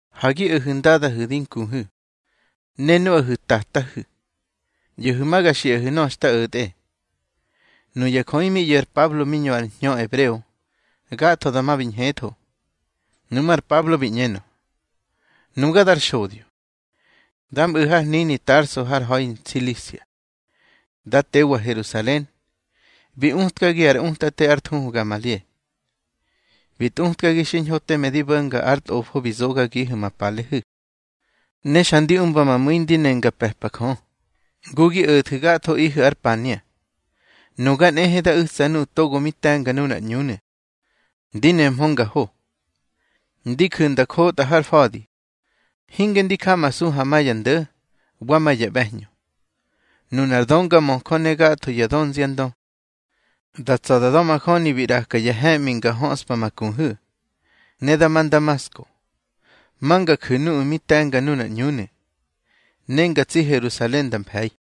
—Ha gi o̱hu̱ ndadahu̱ di nkuhu̱, ne nuꞌahu̱ tatahu̱. ꞌYo̱hu̱ ma ga xiꞌahu̱ nöꞌö xta o̱tꞌe. Nuya jöꞌi mi ꞌyo̱ ar Pablo mi ñö ar hñö ebreo, gatho dama bi ñhetho. Nuꞌmú̱ ar Pablo bi ꞌñenö: —Nuga dar xodyo, da mꞌu̱ har hnini Tarso har ha̱i Nsilisia, da tewa Herusalen. Bi utkagi ar utate ár thuhu ar Gamalie. Bi tꞌutkagi xiñho teme di bo̱nga ar tꞌofo bi zogagihu̱ ma palehu̱. Ne xa ndi umba ma mu̱i ndi ne nga pe̱pa Jö, ngu gi o̱thu̱ gathoꞌihu̱ ar pania. Nuga nꞌehe da u̱tsa nuꞌu̱ togo mi te̱nga nunar ꞌÑunu̱, ndi nehmö nga ho. Ndi ju̱ nda njotꞌa har fa̱di, hinge ndi jamasu ha ma ya ndo̱ wa ma ya ꞌbe̱hñö. Nunar döngamöjö ne gatho ya dönziandö, da tsa̱ da da̱majöni bi ꞌraka ya he̱ꞌmi nga höꞌspa ma kuhu̱. Ne da ma Ndamasko, ma nga ju̱ nuꞌu̱ mi te̱nga nunar ꞌÑunu̱, ne nga tsi Herusalen nda mfe̱i.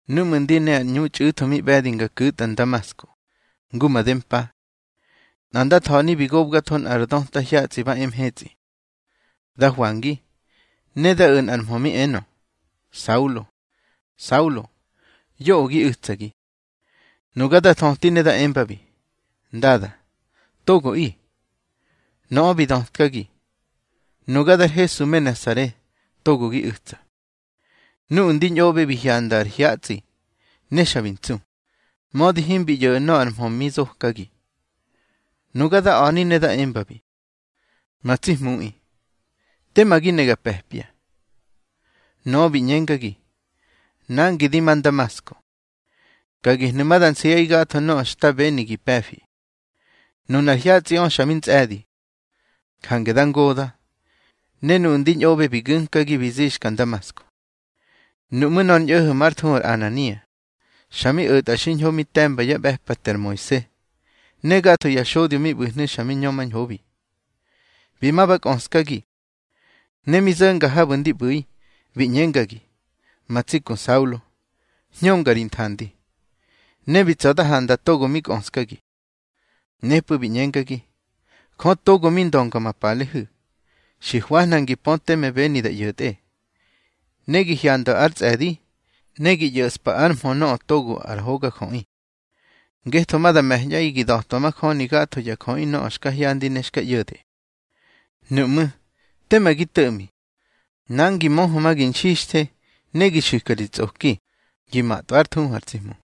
Núꞌmu̱ ndi ne ar ꞌñu txꞌu̱tho mi ꞌbe̱di nga ku̱tꞌa Ndamasko, ngu made mpa, nꞌa nda tha̱ni bi gobgatho nꞌa ra döta hyatsꞌi ba e mhetsꞌi. Da hwangi, ne da o̱ nꞌar mhö mi enö: Saulo, Saulo, yoꞌö gi u̱tsagi. Nuga da thöti ne da embabi: Ndada, togoꞌi. Nöꞌö bi dötkagi: Nuga dar Hesu me Nasare, togo gi u̱tsa. Nuꞌu̱ ndi ñꞌoꞌbe bi hyanda ar hyatsꞌi, ne xa bi ntsu, mödi himbi ꞌyo̱ꞌu̱ nöꞌö ar mhö mi zokagi. Nuga da a̱ni ne da embabi: Ma tsi Hmuꞌi, tema gi ne ga pe̱pya. Nöꞌö bi ꞌñengagi: Nangi di ma Ndamasko, ka gehnu̱ ma da nsiꞌaꞌi gatho nöꞌö xta beni gi pe̱fi. Nunar hyatsꞌiꞌö xa mi ntsꞌe̱di, jange da ngoda̱, ne nuꞌu̱ ndi ñꞌoꞌbe bi gu̱nkagi bi zixka Ndamasko. Nuꞌmú̱ nꞌar ñꞌo̱ho̱ már thuhu Anania, xa mi o̱tꞌa xiñho mi te̱mba yá ꞌbe̱pate ar Moise, ne gatho ya xodyo mi ꞌbu̱hnu̱ xa mi ñömañhobi. Bi ma ba kꞌöskagi, ne mi zo̱nga habu̱ ndi ꞌbu̱i, bi ꞌñengagi: Ma tsi ku Saulo, hñönga ri nthandi. Ne bi tsa̱ da handa togo mi kꞌöskagi. Nepꞌu̱ bi ꞌñengagi: Jö togo mi ndönga ma palehu̱, xi hwañꞌaꞌi ngi pö teme beni da ꞌyo̱tꞌe, ne gi hyandwa ár tsꞌe̱di, ne gi ꞌyo̱ꞌspa ár mhö Nöꞌö Togo ar Hogajöꞌi. Ngetho ma da me̱ñꞌaꞌi gi da̱twa majöni gatho ya jöꞌi nöꞌö xka hyandi ne xka ꞌyo̱de. Nuꞌmú̱, tema gi to̱ꞌmi. Nangi, möhö ma gi nxixthe, ne gi xu̱ka ri tsꞌoki, gi matꞌwa ár thuhu ar tsi Hmu.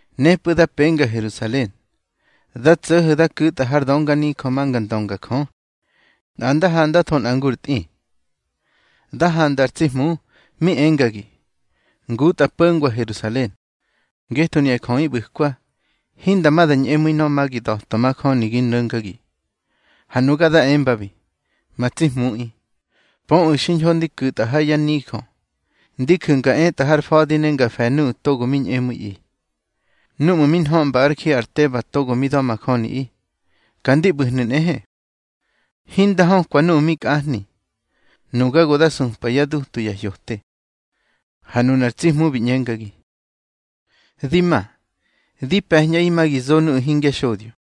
Nepꞌu̱ da penga Herusalen, nda tso̱ho̱ da ku̱tꞌa har dönganijö ma nga ndönga Jö, nꞌa nda handatho nꞌa ngur tꞌi. Da handa ar tsi Hmu, mi engagi: Ngutꞌa po̱ngwa Herusalen, ngetho nuya jöꞌi ꞌbu̱kwa, hinda ma da ñꞌemu̱i nöꞌö ma gi da̱twa majöni gi no̱ngagi. Ha nuga da embabi: Ma tsi Hmuꞌi, pöꞌu̱ xiñho ndi ku̱tꞌa ha yá nijö, ndi ju̱ nga etꞌa ar fa̱di ne ndi fe̱ nuꞌu̱ togo mi ñꞌemu̱iꞌi. Núꞌmu̱ mi nhöꞌmba ár ji ar Teba togo mi da̱majöniꞌi, ka ndi ꞌbu̱hnu̱ nꞌehe. Hinda hökwa nuꞌu̱ mi kꞌahni, nuga go da supa yá dutu ya hyote. Ha nunar tsi Hmu bi ꞌñengagi: Di ma, di pe̱ñꞌaꞌi ma gi zo nuꞌu̱ hingya xodyo.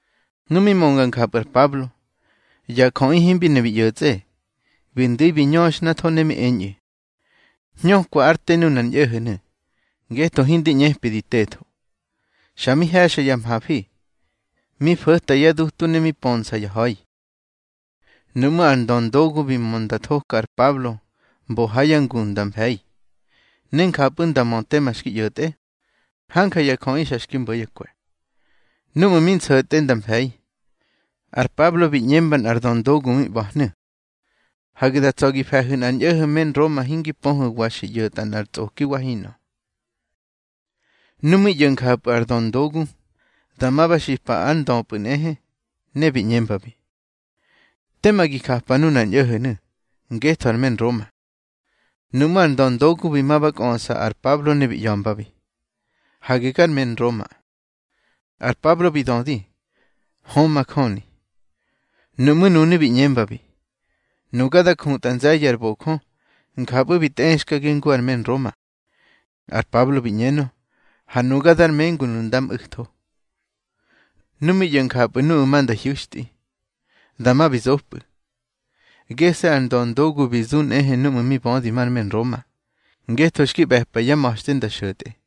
Nu mi mönga njapꞌu̱ ar Pablo, ya jöꞌi himbi ne bi ꞌyo̱tsꞌe. Bi ndu̱i bi ñöxhnatho, ne mi eñꞌu̱: —Hñökwa ár te nunar ñꞌo̱ho̱nu̱, ngetho hindi ꞌñepi di tetho. Xa mi he̱xa ya mhafi, mi fo̱ta yá dutu ne mi pönsa ya ha̱i. Nuꞌmú̱ ar ndöndogu bi mö nda thoka ar Pablo mbo ha yá nguꞌu̱ nda mfe̱i, ne njapꞌu̱ nda mö tema xki ꞌyo̱tꞌe, hanja ya jöꞌi xa xki mbo̱ yá kwe̱. Núꞌmu̱ mi nso̱tꞌe nda mfe̱i, ar Pablo bi ꞌñemba nꞌar döndogu mi ꞌba̱hnu̱: —Hage da tsa̱ gi fe̱hu̱ nꞌar ñꞌo̱ho̱ me Nroma, hingi pöhu̱ wa xi ꞌyo̱tꞌa nꞌar tsꞌoki wa hinꞌö. Nu mi ꞌyo̱ njapꞌu̱ ar döndogu, dama ba xipa ár ndöpꞌu̱ nꞌehe, ne bi ꞌñembabi: —Te ma gi japa nunar ñꞌo̱ho̱nu̱, ngetho ar me Nroma. Nuꞌmú̱ ar ndöndogu bi ma ba kꞌöꞌsa ar Pablo ne bi ꞌya̱mbabi: —Hage gar me Nroma. Ar Pablo bi dödi: —Hö, majöni. Nuꞌmú̱ nunu̱ bi ꞌñembabi: —Nuga da jutꞌa nze̱ye̱ ar bojö, njapꞌu̱ bi tꞌexkagi ngu ar me Nroma. Ar Pablo bi ꞌñenö: —Ha nuga dar mengunu̱ nda mꞌu̱tho. Nu mi ꞌyo̱ njapꞌu̱ nuꞌu̱ ma nda hyu̱xtꞌi, dama bi zopꞌu̱. Gese̱ ar ndöndogu bi zu nꞌehe núꞌmu̱ mi bödi mar me Nroma, ngetho xki ꞌbe̱pa yá ma̱xte nda xo̱tꞌe.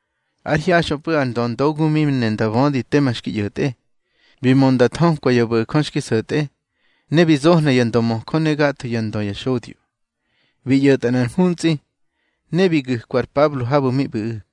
Ár hyaxꞌöpꞌu̱ ar ndöndogu mi ne nda bödi tema xki ꞌyo̱tꞌe, bi mö nda thökwa ya bo̱jö xki so̱tꞌe. Ne bi zohna ya ndömöjö ne gatho yá ndö ya xodyo, bi ꞌyo̱tꞌa nꞌar mhuntsꞌi, ne bi gu̱kwa ar Pablo habu̱ mi ꞌbu̱ꞌu̱.